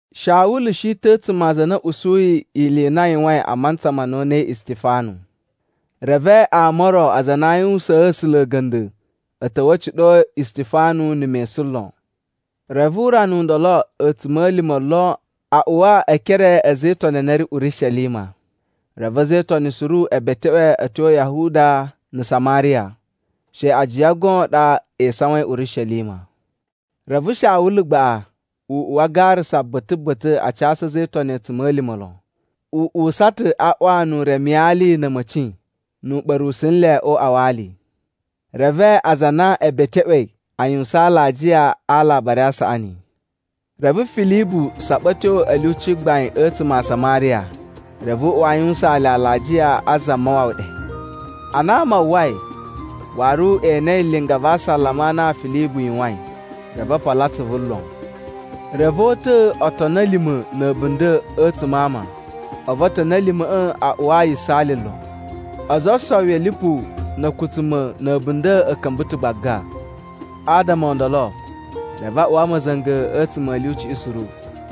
Shawulu shi ta̱ a̱tsuma̱ a aza a na a̱ usuyi ili i na a yuwain a mantsa ma na o unai Istifanu. Reve ama o ro aza a na a yuwusaan A̱sula̱ a̱ga̱nda̱ a̱ ta̱wa̱ a̱ ciɗo Istifanu na̱ mesun lon. Reve urana u ndolo a̱tsuma̱lima̱ lon a uwa e ekere a̱ a̱za̱ e Itoni a na a̱ ri Urishelima. Reve a̱za̱ e Itoni suru e beteꞌwe a̱ tyo Yahuda na̱ Samariya, she ajiya goon a ɗa e isawain Urishelima. Reve Shawulu gbaꞌa u uwa a garasa ba̱ta̱ ba̱ta̱ a casu a̱za̱ e Itoni a̱tsuma̱lima̱ lon. U uwusa ta̱ a ꞌwa nu u remi ali na̱ a̱ma̱ci nu u ɓa̱rusu nle o uꞌwa wa ali. Reve aza a na e beteꞌwei a yuwusan alajiya a Alabari a Saꞌani. Reve Filibu saɓa a̱ tyo a̱ lyuci gbain a̱tsuma̱ a Samariya reve u uwa a yuwusaan le alajiya a Zamawawa ɗe. Ana ama a uwwai, waru e enei linga va asalama a na Filibu yuwain, reve o polo atsuvu lon. Reve o uta̱a̱ otoni a̱ lima̱ na̱ a̱bunda̱ a̱tsuma̱ a ama, a̱vu otoni a̱ lima̱ꞌa̱ a uwa yisaali lon. Ozo o osowi a̱ lipu na̱ a̱kutsuma̱ na̱ a̱bunda̱ a̱ ka̱mba̱ ta̱ gbaga. Adama o ndolo, reve a uwa ma̱za̱nga̱ a̱tsuma̱ a̱ lyuciꞌi suru.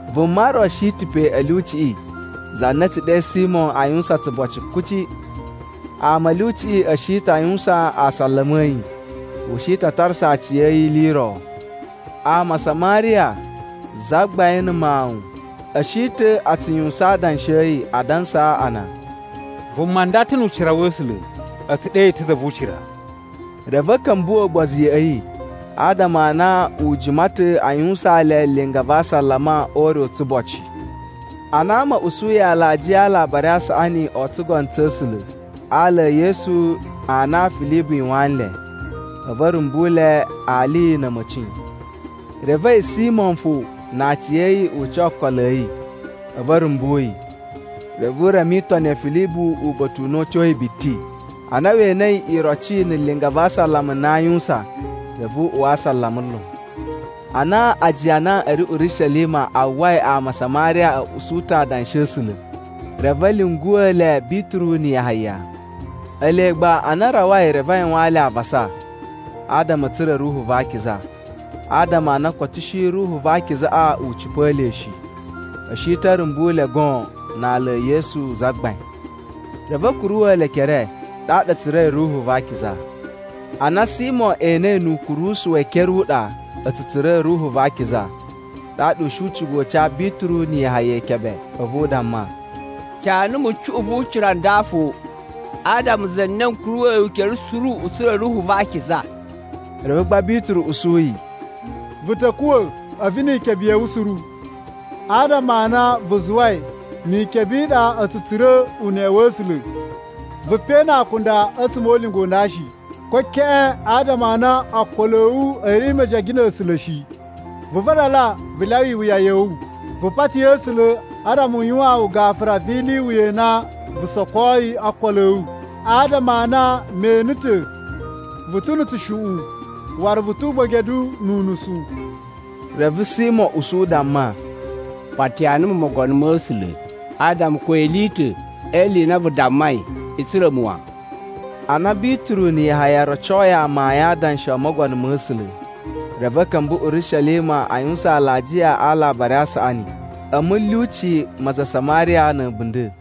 Vuma ro shi ta̱ pe a̱ lyuciꞌi za na a̱ tsu ɗe Simo a yuwusan tsuboci kuci. Ama a̱ lyuciꞌi a̱ shi ta̱ a yuwusan asalama a̱ yi, u shi ta̱ a tarasa aciya̱yi ili i ro. Ama a Samariya zagbain na̱ mawun a̱ shi ta̱ a tsu yuwusan adanshi a̱ yi, adansa a na, “Vuma nda ta̱ nu ucira wa̱ A̱sula̱, a̱ tsu ɗe yi ta̱ Za vu Ucira.” Reve a̱ ka̱mbuwa̱ ugbozu ya̱ꞌa̱ yi adama a na u jima ta̱ a yuwusaan le linga va asalama o ure u tsuboci. Ana ama a̱ usuyi alajiya a Alabari a Saꞌani o tsugono tsa̱ A̱sula̱ a ala e Yesu a na Filibu yuwaan nle, a̱vu a̱ rumbu le ali na̱ a̱ma̱ci. Reve a̱yi Simo fo na aciya̱yi u ca okolo a̱ yi, a̱vu a̱ rumbu yi. Reve u reme itoni ya̱ Filibu uba̱ta̱ u na u tyoyi biti. Ana we enei iroci na̱ linga va asalama a na a yuwusan reve u uwa asalama lon. Ana ajiya a na a̱ ri Urishelima a uwwai ama a Samariya a̱ usu ta̱ adanshi a̱ A̱sula̱, reve a̱ lyunguwa̱ le Bituru na̱ Yahaya. Ele gba ana a rawai reve a yuwaan le avasa adama a̱ tsura̱ Ruhu va Akiza, adama a na koto shi Ruhu va Akizaꞌa u cipa̱a̱ le shi. A̱ shi ta̱ a̱ rumbu le goon na ala e Yesu Zagbain. Reve a̱ kuruwa̱ le ekere, ɗaɗa a̱ tsura̱i Ruhu va Akiza. Ana Simo enei nu ukurusu we ekere u ɗa a̱ tsu tsura̱ Ruhu va Akiza, ɗaɗa u shi u cigai u ca Bituru na̱ Yahaya ikebe. A̱vu u damma, “Ca numu cuꞌun vu ucira u nda fo, adama za na n kuruwa̱yi ukere suru u tsura̱ Ruhu va Akiza!” Reve gba Bituru usu yi, “Vu ta̱ kuwa̱ a̱vu ni ikebe ya̱ wu suru, adama a na vu zuwai ni ikebe i ɗa a̱ tsu tsura̱ uneꞌe wa̱ A̱sula̱.” Vu pe na akunda a̱tsuma̱ o ulinga u nda shi, ko keꞌen, adama a na ookolo a̱ wu a̱ ri mejege na̱ A̱sula̱ shi. Vu vadala vu lyawa iwuya ya̱ wu, vu pati A̱sula̱ adama u yuwaan wu gafura vi ili i wuya i na vu sokoi o ookolo a̱ wu. Adama a na me ene ta̱ vu ta̱ na̱ tsushuꞌun, waru vu tu ugbedegu nu unusu. Reve Simo usu u damma, “Patiya numu Mogono ma̱ A̱sula̱ adama ko ili i ta̱ e ili i na vu dammai i tsura̱ mu wan.” Ana Bituru na̱ Yahaya rocoi amayun a adanshi o Mogono ma̱ A̱sula̱, reve a̱ ka̱mba̱ Urishelima a yuwusan alajiya a Alabari a Saꞌani a̱ mulyuci ma aza a Samariya na̱ a̱bunda̱.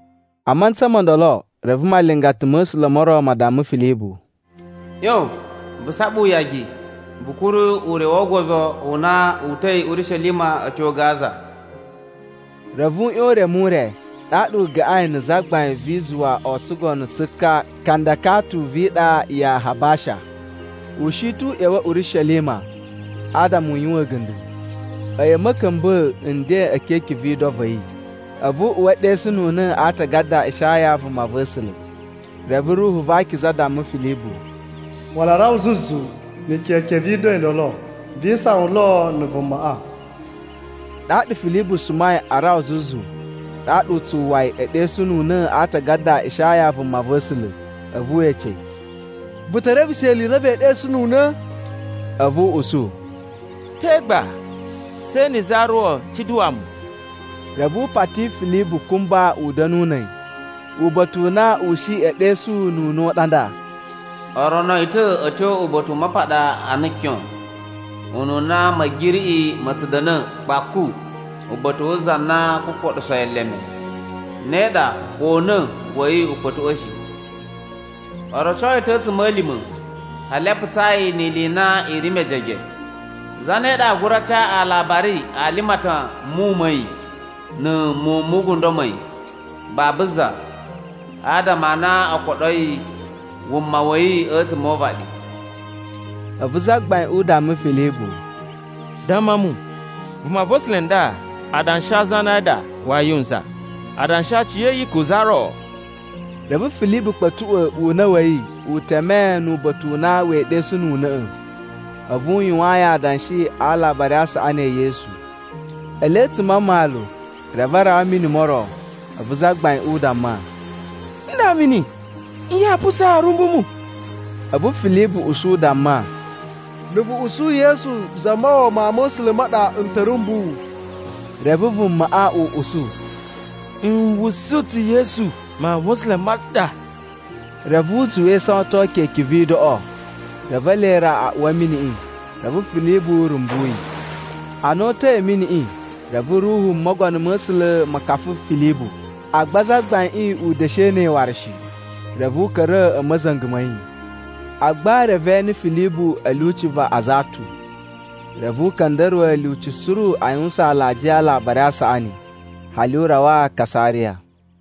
A mantsa mo ndolo reve malingata ma̱ A̱sula̱ mo ro ma damma Filibu, “ꞌYon vu saɓa uyagi vu kuru ure wo ogozo u na wu uta̱i Urishelima a̱ tyo Gaza.” Reve u ꞌyon u reme ure, ɗaɗa u gaꞌain na̱ zagbain vi izuwa o tsugono tsu ka Kandakatu vi iɗa ya Habasha. U shi ta̱ u ꞌya̱wa̱ Urishelima adama u yuwan a̱ga̱nda̱. A̱yi a̱ ma̱ka̱mba̱a̱ nden e keke vi ido va̱ yi, a̱vu u uwa ɗesununa̱ a Aatagada a Ishaya vumava̱sula̱. Reve Ruhu va Akiza damma Filibu, “Wala a rawa zuzu na̱ keke vi ido i ndolo, vi isawan lo na̱ vumaꞌa.” Ɗaɗa Filibu sumai a rawa zuzu ɗaɗa u tsu uwwa yi e ɗesununa̱ a aatagada a Ishaya vumava̱sula̱. A̱vu we ece yi, “Vu te reveshe ili i na vee ɗesununa̱?” A̱vu u usu, “Te gba? She na̱ za ro cuɗuwa mu.” Reve u pati Filibu kumba u da̱nu na̱ a̱yi. Uba̱ta̱ u na u shi e ɗesununa̱ u ɗa nda, “O rono yi ta̱ a̱ tyo uba̱ta̱ u mapaɗa ana kyon, ununa ma̱giriꞌi ma̱ tsu da̱na̱ kpaku uba̱ta̱ wu za na oo kukoɗuso yi eleme, ne ɗa ko una̱ wa̱ yi u kpa̱tuꞌwa̱ shi. O roco yi ta̱ a̱tsuma̱lima̱ hali a putsaa yi ni ili i na i ri mejege. Zane ɗa aa gura ca alabari a limatan a̱ muwun ma̱ yi na̱ muwun mu ugundo ma̱ yi? Babu za, adama a na o koɗoi wuma wa̱ yi a̱tsuma̱ o uvaɗi.” A̱vu zagbaiꞌin u damma Filibu, “Damma mu, vumava̱sula̱ nda adanshi a̱ zane a ɗa waa yuwusan? Adanshi a aciya̱yi ko za ro?” Reve Filibu kpa̱tuꞌwa̱ una̱ wa̱ yi u teme nu uba̱ta̱ u na wee ɗesununa̱ꞌa̱, a̱vu u yuwaan yi adanshi a Alabari a Saꞌani e Yesu. Ele a̱tsuma̱ a mmalu, reve a rawa a̱ mini mo ro. A̱vu zagbaiꞌin u damma, “Nda mini! Nye yaa putsaa a̱a̱ rumbu mu?” [ A̱vu Filibu usu u damma, “Na̱ vu usu Yesu Zamawawa Mawun ma̱ A̱sula̱ ma ɗa, n ta̱ rumbu wu.” Reve vumaꞌa u usu, “N usu ta̱ Yesu Mawun ma̱ A̱sula̱ ma ɗa.]” Reve u zuwa e isawaton keke vi idoꞌo. Reve ele ra a uwa a̱ miniꞌi, reve Filibu rumbu yi. Ana o uta̱i a̱ miniꞌi, reve Ruhu Mogono ma̱ A̱sula̱ ma̱ ka̱fa̱ Filibu, agba zagbaiꞌin u da̱shi ene yi waru shi. Reve u ka̱ra̱ a̱ ma̱za̱nga̱ ma̱ yi. Agba reve e ene Filibu a̱ lyuci va Azatu. Reve u ka̱nda̱ruwa̱ ilyuci suru a yuwusan alajiya a Alabari a Saꞌani, hali u rawa Kasariya.